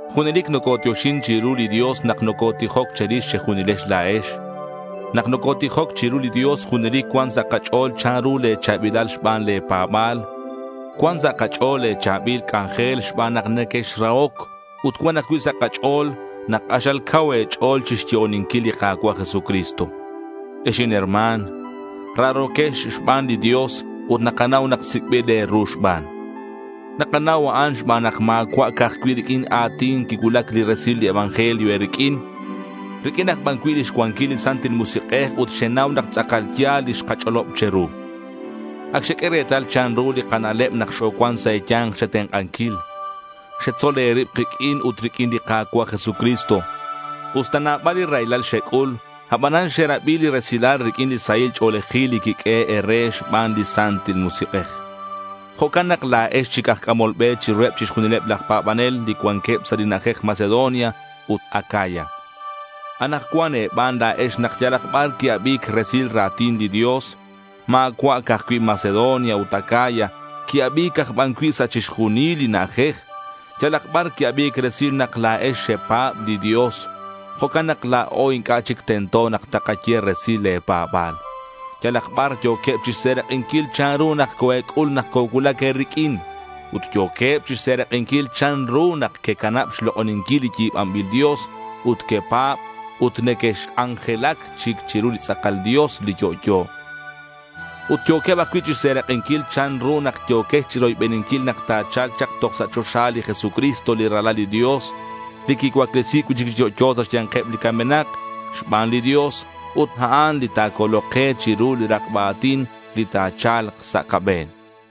Junelic nocotioxin chiru li Dios nak nocotijoc che̱rix che̱junilex la̱ex. Nak nocotijoc chiru li Dios, junelic cuan sa' kach'o̱l chanru le̱ cha̱bilal xban le̱ pa̱ba̱l. Cuan sa' kach'o̱l le̱ cha̱bil c'anjel xban nak nequexrahoc ut cuan ajcui' sa' kach'o̱l nak k'axal cau e̱ch'o̱l chixyo'oninquil li Ka̱cua' Jesucristo. Ex inherma̱n, raro̱quex xban li Dios ut nakanau nak sic'bil e̱ru xban. Nakanau a'an xban nak ma̱cua' ca'aj cui' riq'uin a̱tin quicuulac li resil li evangelio e̱riq'uin. Riq'uin aj ban cui' lix cuanquil li Santil Musik'ej ut xenau nak tz'akal ya̱l li xkach'olob che̱ru. Ac xeq'ue retal chanru li kana'leb nak xocuan sa' e̱ya̱nk che̱tenk'anquil. Xetzol e̱rib kiq'uin ut riq'uin li Ka̱cua' Jesucristo. Usta nabal li raylal xec'ul, abanan xerabi li resilal riq'uin li sahil ch'o̱lejil li quiq'uehe' e̱re xban li Santil Musik'ej. Jo'can nak la̱ex chic aj c'amol be chiruheb chixjunileb laj pa̱banel li cuanqueb sa' li na'ajej Macedonia ut Acaya. Anakcuan e̱ban la̱ex nak yalak bar qui-abi̱c resil ra̱tin li Dios. Ma̱cua' ca'aj cui' Macedonia ut Acaya. Qui-abi̱c ban ajcui' sa' chixjunil li na'ajej. Yalak bar qui-abi̱c resil nak la̱ex xepa̱b li Dios. Jo'can nak la̱o inc'a' chic tento nak takaye resil le̱ pa̱ba̱l. Yalak bar yo̱queb chixserak'inquil chanru nak coe̱c'ul nak cocuulac e̱riq'uin ut yo̱queb chixserak'inquil chanru nak quecanab xlok'oninquil li yi̱banbil dios ut quepa̱b ut nequexc'anjelac chic chiru li tz'akal Dios, li yo'yo. Ut yo̱queb ajcui' xserak'inquil chanru nak yo̱quex chiroybeninquil nak ta̱cha̱lk chak toj sa' choxa li Jesucristo li Ralal li Dios, li quicuaclesi̱c cui'chic chi yo'yo sa' xya̱nkeb li camenak xban li Dios ut a'an li ta̱colok ke chiru li rakba a̱tin li ta̱cha̱lk sa' kabe̱n.